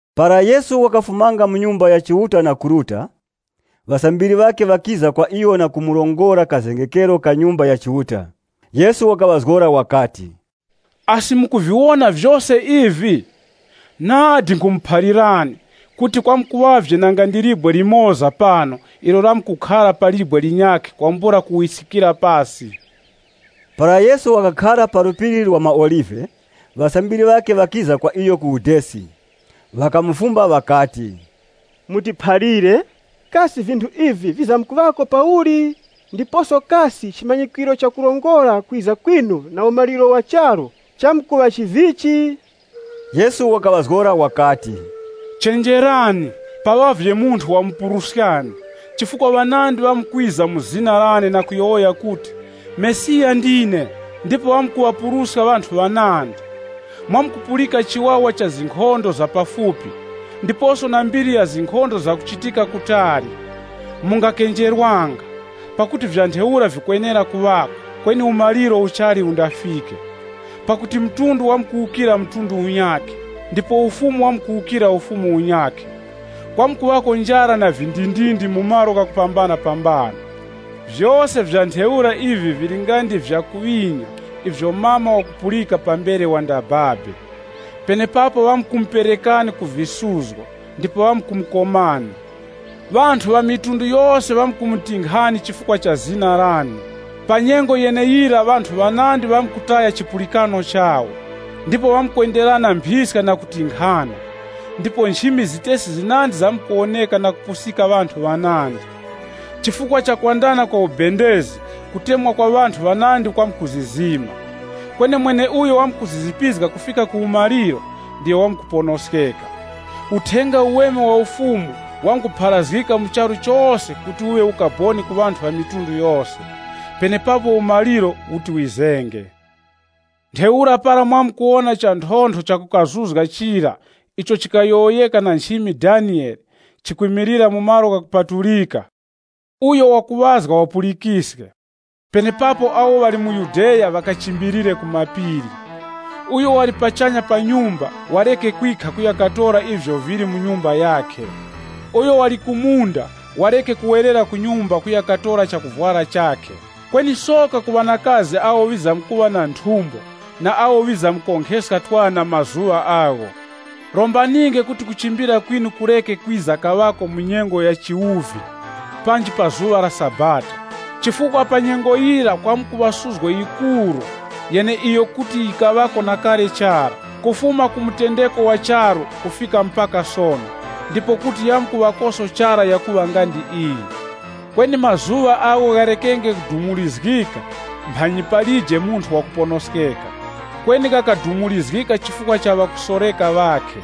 Para Yesu wakafumanga mu Nyumba ya Chiuta na kuruta, ŵasambiri ŵakhe ŵakiza kwa iyo na kumurongora kazengekero ka Nyumba ya Chiuta. Yesu wakaŵazgora wakati, “Asi, mukuviwona vyose ivi? Nadi nkhumuphalirani, kuti kwamkuŵavye nanga ndi libwe limoza pano ilo lamkukhara pa libwe linyakhe kwambula kuwiskikira pasi.” Para Yesu wakakhara pa Phiri la maOlive, ŵasambiri ŵakhe ŵakiza kwa iyo ku udesi. Ŵakamufumba ŵakati, “Mutiphalire, kasi vinthu ivi vizamkuŵako pauli, ndiposo kasi chimanyikwiro chakurongora kwiza kwinu na umaliro wa charu chamkuŵa chivichi?” Yesu wakaŵazgora wakati, “Chenjerani, paŵavye munthu wamupuruskani. Chifukwa ŵanandi ŵamkwiza mu zina lane na kuyowoya kuti, ‘Mesiya ndine,’ ndipo ŵamkuŵapuruska ŵanthu ŵanandi. Mwamkupulika chiwawa cha zinkhondo za pafupi, ndiposo na mbiri ya zinkhondo zakuchitika kutali. Mungakenjerwanga, pakuti vya ntheura vikwenera kuŵako, kweni umaliro uchali undafike. Pakuti mtundu wamkuwukira mtundu unyakhe, ndipo ufumu wamkuwukira ufumu unyakhe. Kwamkuŵako njara na vindindindi mu malo ghakupambanapambana. Vyose vya ntheura ivi vili nga ndi vyakuŵinya ivyo mama wakupulika pambere wandababe. “Penepapo ŵamkumuperekani ku visuzgo ndipo ŵamkumukomani. Ŵamitundu yose ŵamkumutinkhani chifukwa cha zina lane. Pa nyengo yeneyira ŵanthu ŵanandi ŵamkutaya chipulikano chawo, ndipo ŵamkwenderana mphiska na kutinkhana. Ndipo nchimi zitesi zinandi zamkuwoneka na kupusika ŵanthu ŵanandi. Chifukwa chakwandana kwa ubendezi, kutemwa kwa ŵanthu ŵanandi kwamkuzizima. Kweni mweneuyo wamkuzizipizga kufika ku umaliro, ndiyo wamkuponoskeka. Uthenga Uweme wa Ufumu wamkupharazgika mu charu chose kuti uŵe ukaboni ku ŵamitundu yose. Penepapo umaliro uti wizenge.” “Ntheura para mwamkuwona chanthontho chakukazuzga chira icho chikayowoyeka na nchimi Daniyele, chikwimilira mu malo ghakupatulika, (Uyo wakuŵazga wapulikiske), penepapo awo ŵali mu Yudeya ŵakachimbilire ku mapiri. Uyo wali pachanya pa nyumba, wareke kwikha kuya katora ivyo vili mu nyumba yakhe. Uyo wali ku munda, wareke kuwerera ku nyumba kuya katora chakuvwara chakhe. Kweni soka ku ŵanakazi awo ŵizamkuŵa na nthumbo na awo ŵizamkonkheska twana mazuŵa agho! Rombaninge kuti kuchimbira kwinu kureke kwiza kaŵako mu nyengo ya chiwuvi, panji pa zuŵa la Sabata. Chifukwa pa nyengo yira kwamkuŵa suzgo yikuru, yeneiyo kuti yikaŵako na kale chara, kufuma ku mutendeko wa charu kufika mpaka sono, ndipo kuti yamkuŵakoso chara yakuŵa nga ndi iyi. Kweni mazuŵa agho gharekenge kudumurizgika, mphanyi palije munthu wakuponoskeka. Kweni ghakadumurizgika chifukwa cha ŵakusoreka ŵakhe.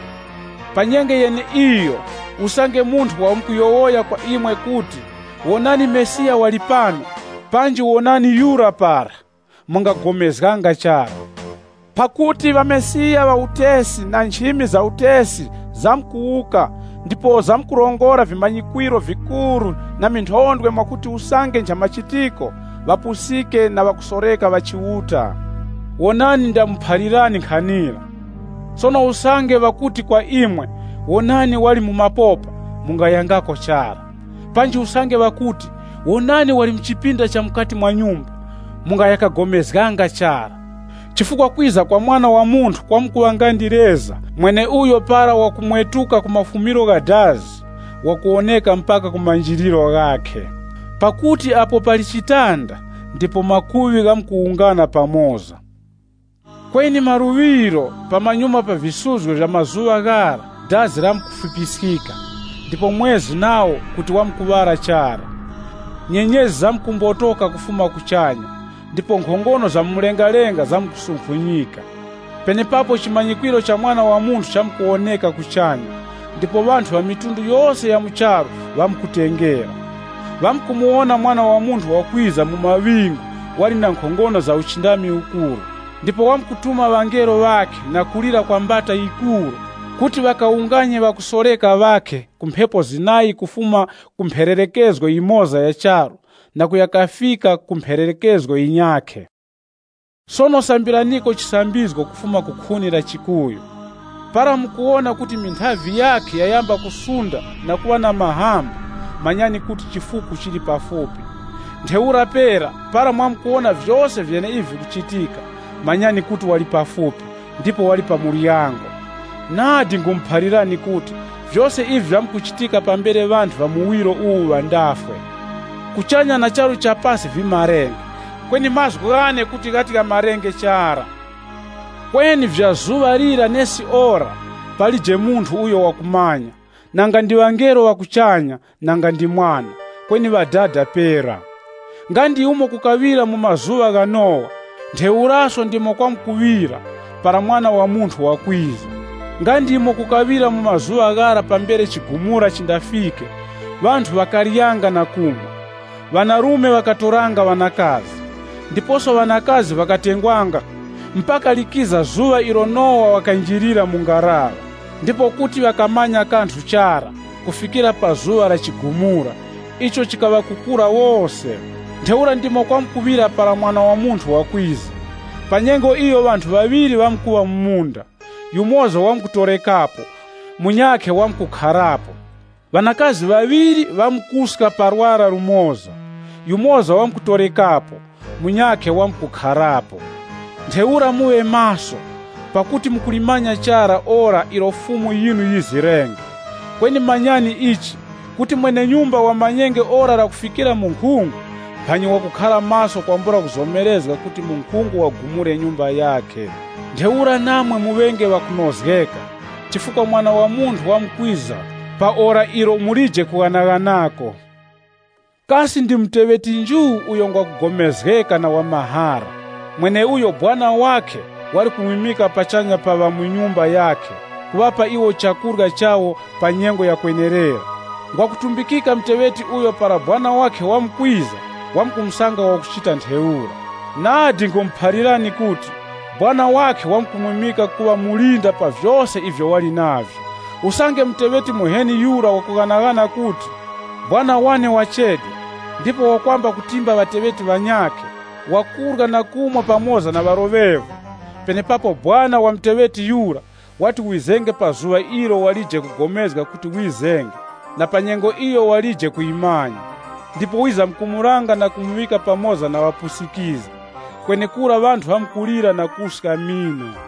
“Pa nyengo yeneiyo usange munthu wamkuyowoya kwa imwe kuti, ‘Wonani Mesiya wali pano!’, panji ‘Wonani yura para!’ Mungaya kapulikananga chara. Pakuti ŵamesiya ŵa utesi na nchimi za utesi zamkuwuka ndipo zamkurongora vimanyikwiro vikuru na minthondwe mwakuti usange nchamachitiko ŵapusiske na ŵakusoreka ŵa Chiuta wuwo. Wonani ndamuphalirani nkhanira. “Sono usange wakuti kwa imwe, ‘Wonani wali mu mapopa! Mungayangako chara.’ Panji usange ŵakuti ‘Wonani wali mu chipinda cha mukati mwa nyumba,’ mungaya kapulikananga chara. Chifukwa kwiza kwa Mwana wa Munthu kwamkuŵa nga ndi leza mweneuyo para wakumwetuka ku mafumiro gha dazi, wakuwoneka mpaka ku manjiliro ghakhe. “Pakuti apo pali chitanda, ndipo makuŵi ghamkuwungana pamoza.” “Kweni maluŵiro, pamanyuma pa visuzgo vya mazuŵa ghara, dazi lamkufipiskika, ndipo mwezi nawo kuti wamkuŵala chara. Nyenyezi zamkumbotoka kufuma kuchanya, ndipo nkhongono za mu mlengalenga zamkusunkhunyika.” Penepapo chimanyikwiro cha Mwana wa Munthu chamkuwoneka kuchanya, ndipo ŵanthu ŵa mafuko ghose gha mu charu ŵamkutengera. Ŵamkumuwona Mwana wa Munthu wakwiza mu maŵingu, wali na nkhongono na uchindami ukuru. Ndipo wamkutuma ŵangelo ŵakhe na kulira kwa mbata yikuru, kuti ŵakawunganye ŵakusoreka ŵakhe ku mphepo zinayi, kufuma mphererekezgo yimoza ya charu na kuya kafika ku mphererekezgo yinyakhe. “Sono sambiraniko chisambizgo kufuma ku khuni la chikuyu. Para mukuwona kuti minthavi yakhe yayamba kusunda na kuŵa na mahamba, manyani kuti chifuku chili pafupi. Ntheura pera, para mwamkuwona vyose vyeneivi vikuchitika, manyani kuti wali pafupi, ndipo wali pa muryango. Nadi nkhumuphalirani kuti, vyose ivi vyamkuchitika pambere ŵanthu ŵa muwiro uwu ŵandafwe. Kuchanya na charu cha pasi vimarenge, kweni mazgu ghane kuti ghati ghamarenge chara. “Kweni vya zuŵa lira nesi ora, palije munthu uyo wakumanya, nanga ndi ŵangelo ŵa kuchanya nanga ndi Mwana, kweni Ŵadada pera. Nga ndi umo kukaŵira mu mazuŵa gha Nowa, ntheuraso ndimo kwamkuŵira para Mwana wa Munthu wakwiza. Nga ndi umo kukaŵira mu mazuŵa ghara pambere chigumura chindafike, ŵanthu ŵakaryanga na kumwa, ŵanarume ŵakatoranga ŵanakazi, ndiposo ŵanakazi ŵakatengwanga mpaka likiza zuŵa ilo Nowa wakanjirira mu ngaraŵa. Ndipo kuti ŵakamanya kanthu chara kufikira pa zuŵa la chigumura, icho chikaŵakukura wose. Ntheura ndimo kwamkuŵira para Mwana wa Munthu wakwiza. Pa nyengo iyo ŵanthu ŵaŵiri ŵamkuŵa mu munda, yumoza wamkutorekapo, munyakhe wamkukharapo. Ŵanakazi ŵaŵiri ŵamkuska pa lwara lumoza. Yumoza wamkutorekapo, munyakhe wamkukharapo. Ntheura muŵe maso, pakuti mukulimanya chara ora ilo Fumu yinu yizirenge. Kweni manyani ichi kuti mwene-nyumba wamanyenge ora lakufikira munkhungu, mphanyi wakukhara maso kwambula kuzomerezga kuti munkhungu wagumure nyumba yakhe. Ntheura namwe muŵenge ŵakunozgeka chifukwa Mwana wa Munthu wamkwiza pa ora ilo mulije kughanaghanako. “Kasi ndi muteŵeti nju uyo ngwa kugomezgeka na wa mahara, mweneuyo sekuru wakhe wali kumwimika pachanya pa ŵa mu nyumba yakhe kuŵapa iwo chakurya chawo pa nyengo yakwenerera? Ngwa kutumbikika muteŵeti uyo para sekuru wakhe wamkwiza, wamkusanga wakuchita ntheura. Nadi nkhumuphalirani kuti, sekuru wakhe wamkumwimika kuŵa mulinda pa vyose ivyo wali navyo. Usange muteŵeti muheni yura wakughanaghana kuti, ‘Sekuru wane wachedwa,’ ndipo wakwamba kutimba ŵateŵeti ŵanyakhe, wakurya na kumwa pamoza na ŵaloŵevu, penepapo sekuru wa muteŵeti yura, wati wizenge pa zuŵa ilo walije kugomezga kuti wizenge na pa nyengo iyo ŵalije kuyimanya. Ndipo wizamkumulanga na kumuŵika pamoza na ŵapusikizgi. Kwenekura ŵanthu ŵamkulira na kuska mino.